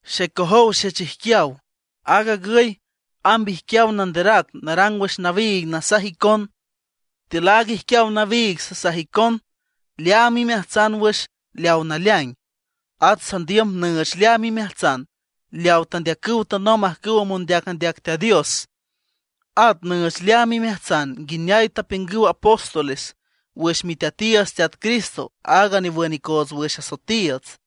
Xecojow xechijquiaw, aag agüy amb ijquiaw nanderac narang wüx nawiig nasaj icon. Tiül aaga ijquiaw nawiig sasaj icon leaam imeajtsan wüx leaw naleaing. At sandiüm nüüch leaam imeajtsan leawa tandeacüw tanomb ajcüw mondeac andeac Teat Dios, at nüüch leaam imeajtsan nguineay tapiüngüw apóstoles wüx Miteatiiüts Teat Cristo, aaga newün icoots wüx asoetiiüts.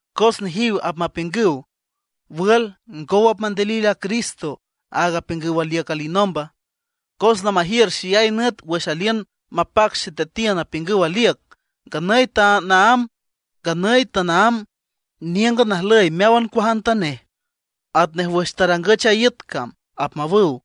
Cos nejiw apmapiüngüw: “¿Wül, ngow apmandilil a Cristo, aaga apiüngüw aliüc alinomba? Cos lamajiür xeyay nüt wüx aliün mapac xeteatiün tapiüngüw aliüc. Nganüy tanaámb níüngan ajlüy meáwan cuajantanej, atnej wüx tarangüch a iüt cam”, apmawüw.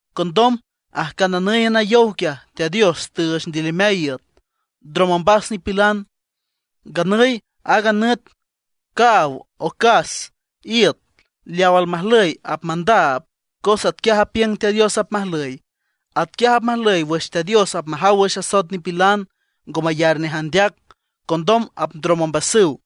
Condom ajcananǘyan a yow, Teat Dios tüüch ndilimeay iüt, ndrom ombas nipilan. Nganüy aaga nüt, caaw, ocas, iüt, leaw almajlüy apmandaab, cos atquiaj apiüng Teat Dios apmajlüy. Atquiaj apmajlüy wüx Teat Dios apmajaw wüx asoet nipilan ngo mayar nej andeac. Condom apndrom ombasüw.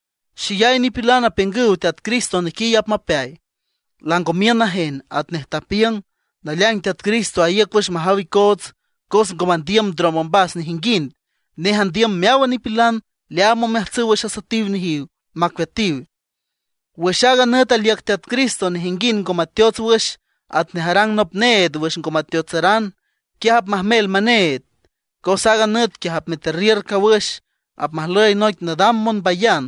Xeyay nipilan apiüngüw Teat Cristo nequiy apmapeay, lango miün najen atnej tapiüng. Naleaing Teat Cristo aíüc wüx majaw icoots, cos ngo mandiüm ndrom ombas nejinguind. Nej andiüm meáwan nipilan leaam omeajtsüw wüx asoetiw nejiw, macueatiw. Wüx aaga nüt aliüc Teat Cristo nejinguind ngo mateots wüx, atnej arang nop need wüx ngo mateotsaran, quiaj apmajmel meneed. Cos aaga nüt quiaj apmeterriür cawüx, apmajlüy noic nadam monbayan.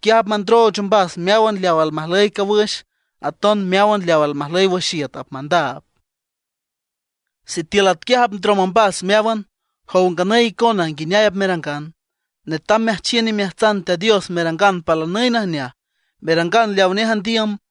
Quiaj apmandrooch ombas meáwan leaw almajlüy cawüx, aton meáwan leaw almajlüy wüx iüt apmandaab. Sitiül atquiaj apndrom ombas meáwan, ¿jow nganüy icona, nguineay apmerangan? Netam meajchiün imeajtsan Teat Dios merangan palanüy najneaj, merangan leawa nej andiüm.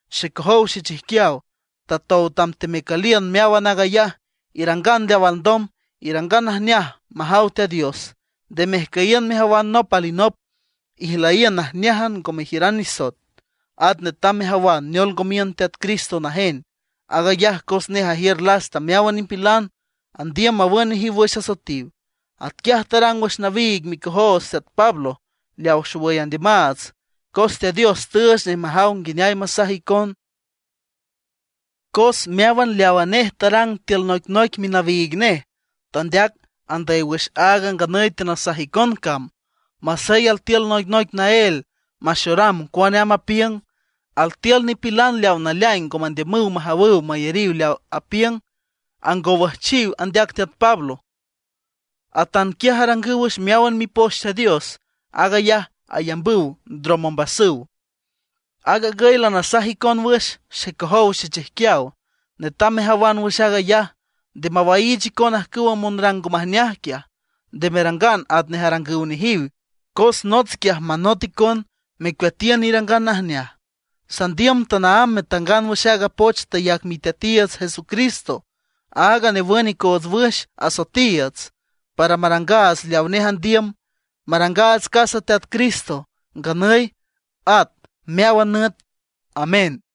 Xecojow xechijquiaw, tatow tam teamecüliün meáwan aag ayaj, irangan leaw alndom, irangan najneaj majaw Teat Dios. Nde mejcüyiün mejawan nop alinop, ijlüyiün najneájan, ngo mejiüran nisoet. At netam mejawan neol ngo miün Teat Cristo najen. Aag ayaj, cos nej ajiür lasta meáwan nipilan, andiüm mawün nejiw wüx asoetiw. Atquiaj tarang wüx nawiig micojoots teat Pablo, leawa xowüy andiümaats, cos Teat Dios tüüch nej majaw nguineay masaj icon. Cos meáwan leawa nej tarang tiül noicnoic minawiig nej tandeac andüy wüx aaga nganüy teanasaj icon cam, masey altiül noicnoic naél maxoram cuane amb apiüng. Altiül nipilan leaw naleaing ngo mandiümüw majawüw mayariw leaw apiüng, angowüjchiw andeac teat Pablo. Atanquiaj arangüw wüx meáwan Mipoch Teat Dios. Aag ayaj ayambüw ndrom ombasüw. Aag agüy lanasaj icon wüx, xecojow xechijquiaw, netam mejawan wüx aag ayaj, nde mawaiich icon ajcüwa monrang ngo majneaj quiaj, nde merangan atnej arangüw nejiw, cos nots quiaj manot icon, mecueatiün irangan najneaj. Sandiüm tanaámb metangan wüx aaga poch tayac Miteatiiüts Jesucristo, aaga newün icoots wüx asoetiiüts, para marangaats leaw nej andiüm. Marangaats casa Teat Cristo nganüy at meáwan nüt. Amén.